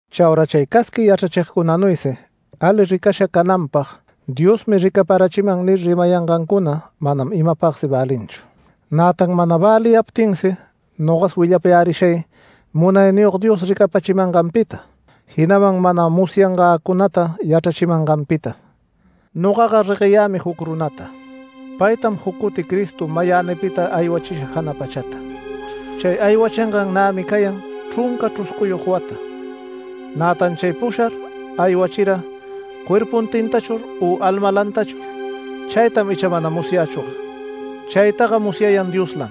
Chaura chay casqui yachrachigcunanuysi ali ricasha cananpag “Diosmi ricaparachiman” nir rimayangancuna manam imapagsi välinchu. Nätan mana väliyaptinsi nogas willapayärishay Munayniyog Dios ricapächimanganpita, jinaman mana musyangäcunata yachrachimanganpita. Nogaga regueyämi juc runata. Paytam juc cuti Cristo mayänipita aywachisha jana pachata. Chay aywachingan nämi cayan chrunca chruscuyog wata. Nätan chay pushar aywachira ¿cuerpuntintachur u almalantachur? Chaytam icha mana musyächüga. Chaytaga musyayan Dioslam.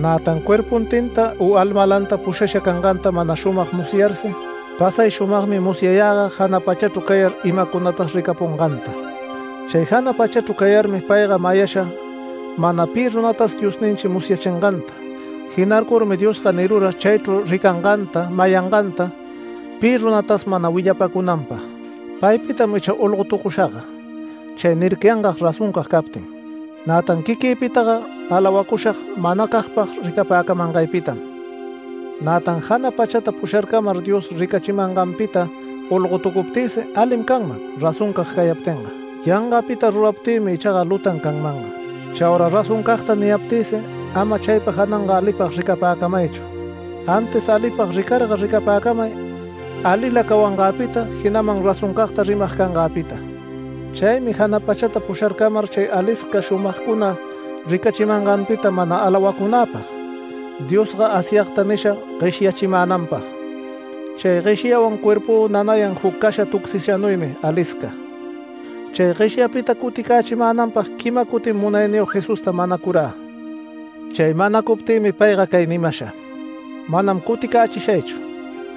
Nätan cuerpuntinta u almalanta pushasha canganta mana shumag musyarsi, pasay shumagmi musyayäga jana pachachru cayar imacunatas ricapunganta. Chay jana pachachru cayarmi payga mayasha mana pi runatas Diosninchi musyachinganta. Jinarcurmi Diosga nirura chaychru ricanganta, mayanganta pi runatas mana willapacunanpag. Paypitam icha olgotucushagga, chay nircayangag razoncag captin. Nätan quiquïpitaga alawacushag manacagpag ricapäcamangaypitam. Nätan jana pachata pusharcamar Dios ricapachimanganpita olgotucuptïsi alim canman razoncag cayaptinga. Yangapita ruraptïmi ichaga lutan canmanga. Chaura razoncagta niyaptïsi ama chaypa jananga alipag ricapäcamaychu. Antis alipag ricarga ricapäcamay alila cawangäpita, jinaman razoncagta rimag cangäpita. Chaymi jana pachata pusharcamar chay alisca shumagcuna ricachimanganpita mana alawacunäpag, Diosga Asyagta nisha gueshyachimänanpag. Chay gueshyawan cuerpü nanayan juc casha tucsishanuymi alisca. Chay gueshyapita cuticächimänanpag quima cutin Munayniyog Jesusta manacurä. Chay manacuptïmi payga cay nimasha: “Manam cuticächishaychu,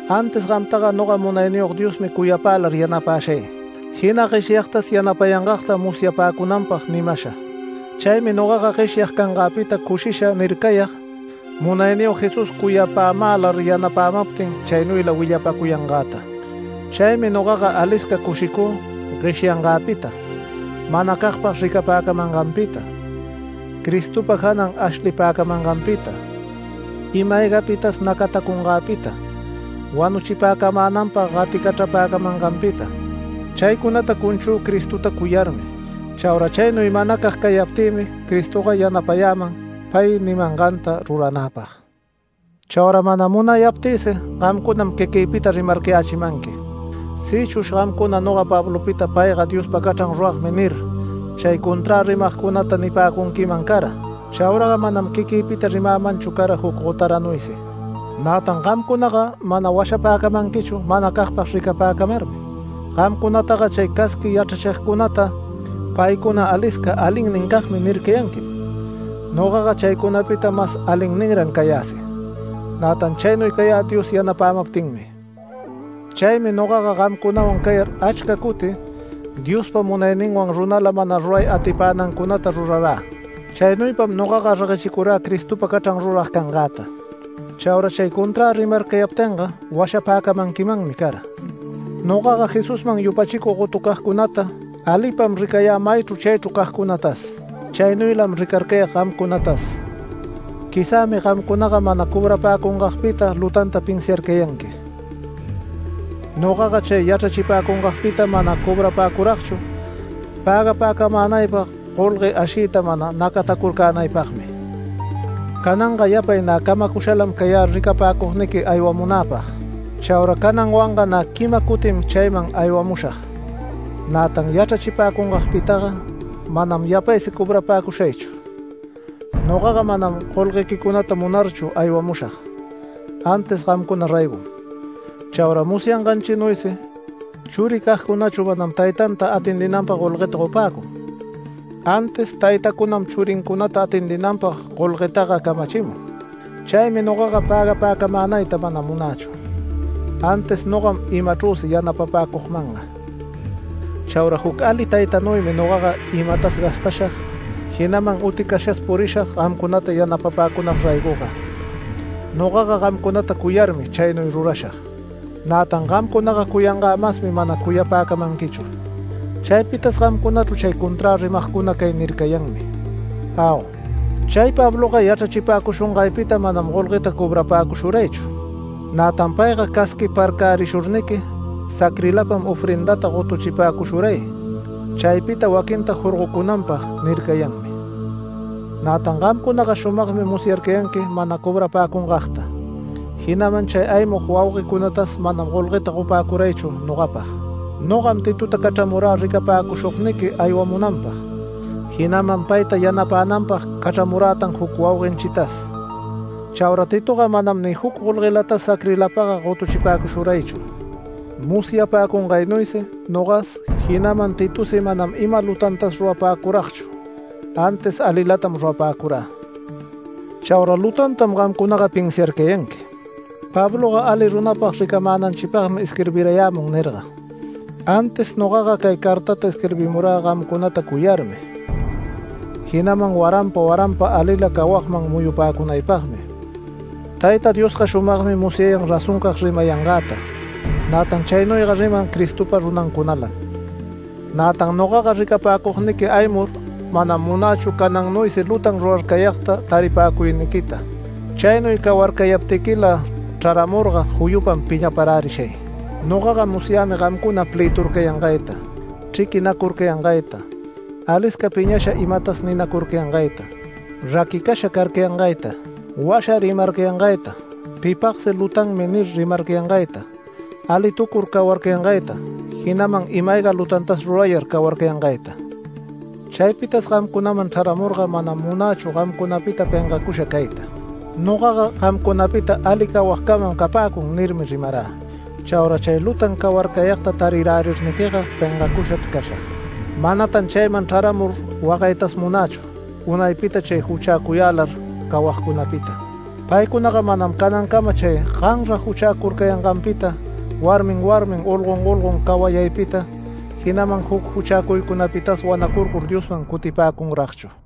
antis gamtaga noga Munayniyog Diosmi cuyapälar yanapäshay, jina gueshyagtas yanapayangagta musyapäcunanpag” nimasha. Chaymi nogaga gueshyag cangäpita cushisha nircayag Munayniyog Jesús cuyapämälar yanapämaptin chaynuyla willapäcuyangäta. Chaymi nogaga alisca cushicü gueshyangäpita manacagpag ricapäcamanganpita, Cristopa janan ashlipäcamanganpita, ima-aygapitas nacatacungäpita, wanuchipäcamänanpag gaticachrapäcamanganpita. Chaycunata cunchü Cristota cuyarmi. Chaura chaynuy manacag cayaptïmi Cristoga yanapayäman pay nimanganta ruranäpag. Chaura mana munayaptïsi gamcunam quiquïpita rimarcayächimanqui. Sïchush gamcuna noga Pablopita “Payga Diospa cachran ruragmi” nir, chay conträ rimagcunata nipäcunquiman cara, chauraga manam quiquïpita rimämanchu cara juc gotaranuysi. Nätan gamcunaga mana washapäcamanquichu manacagpag ricapäcamarmi. Gamcunataga chay casqui yachrachigcunata “Paycuna alisca alinnincagmi” nircayanquim. Nogaga chaycunapita mas alinninran cayäsi. Nätan chaynuy cayä Dios yanapämaptinmi. Chaymi nogaga gamcunawan cayar achca cuti Diospa munayninwan runala mana ruray atipänancunata rurarä. Chaynuypam nogaga reguechicurä Cristopa cachran rurag cangäta. Chaura chay conträ rimarcayaptinga washapäcamanquimanmi cara. Nogaga Jesusman yupachicug gotucagcunata alipam ricayä maychru chaychru cagcunatas, chaynuylam ricarcayag gamcunatas. Quizämi gamcunaga mana cobrapäcungagpita lutanta pinsiarcayanqui. Nogaga chay yachrachipäcungagpita mana cobrapäcuragchu pägapäcamänaypag golgue ashiyta mana nacatacurcänaypagmi. Cananga yapay nä camacushalam cayä ricapäcugniqui aywamunäpag. Chaura cananwanga nä quima cutim chayman aywamushag. Nätan yachrachipäcungagpitaga manam yapaysi cobrapäcushaychu, nogaga manam golguequicunata munarchu aywamushag, antis gamcuna raygom. Chaura musyanganchinuysi, churicagcunachu manam taytanta atendinanpag golguëta gotupäcun, antis taytacunam churincunata atendinanpag golguetaga camachimun. Chaymi nogaga pägapäcamänayta mana munächu, antis nogam imachrüsi yanapapäcugmanga. Chaura juc ali taytanuymi nogaga imätas gastashag, jinaman uticashas purishag gamcunata yanapapäcunag raygoga. Nogaga gamcunata cuyarmi chaynuy rurashag. Nätan gamcunaga cuyangä masmi mana cuyapäcamanquichu. Chaypitas gamcunachru chay conträ rimagcuna cay nircayanmi: “Au, chay Pabloga yachrachipäcushungaypita manam golgueta cobrapäcushuraychu. Nätan payga casquiparcärishurniqui sacrilapam ofrendata gotuchipäcushuray chaypita waquinta jorgocunanpag” nircayanmi. Nätan gamcunaga shumagmi musyarcayanqui mana cobrapäcungagta. Jinaman chay aymug wauguecunatas manam golgueta gopäcuraychu nogapag. Nogam Titota cachramurä ricapäcushugniqui aywamunanpag, jinaman payta yanapänanpag cachramurätan juc wauguenchitas. Chaura Titoga manam ni juc golguetas sacrilapaga gotuchipäcushuraychu. Musyapäcungaynuysi nogas, jinaman Titosi manam ima lutantas rurapäcuragchu antis alilatam rurapäcurä. Chaura lutantam gamcunaga pinsiarcayanqui: “Pabloga ali runapag ricananchipagmi isquirbirayämun” nirga, antis nogaga cay cartata isquirbimurä gamcunata cuyarmi, jinaman waranpa waranpa alila cawagman muyupäcunaypagmi. Tayta Diosga shumagmi musyayan razoncag rimayangäta, nätan chaynuyga riman Cristopa runancunalam. Nätan nogaga ricapäcugniqui aymur manam munächu canannuysi lutan rurarcayagta taripäcuyniquita. Chaynuy cawarcayaptiquila chraramurga juyupam piñaparärishay. Nogaga musyämi gamcuna, plëturcayangayta, chriquinacurcayangayta, alisca piñasha imatas ninacurcayangayta, raquicasha carcayangayta, washa rimarcayangayta, pipagsi “Lutanmi” nir rimarcayangayta, alitucur cawarcayangayta, jinaman ima-ayga lutantas rurayar cawarcayangayta. Chaypitas gamcunaman chraramurga manam munächu gamcunapita pengacusha cayta. “Nogaga gamcunapita ali cawagcamam capäcun” nirmi rimarä. Chaura chay lutan cawarcayagta tarirärirniquiga pengacushachr cashag. Manatan chayman chraramur wagaytas munächu unaypita chay juchäcuyälar cawagcunapita. Paycunaga manam canancama chay ganra juchäcurcayanganpita, warmin warmin, olgon olgon cawayaypita, jinaman juc juchäcuycunapitas wanacurcur Diosman cutipäcunragchu.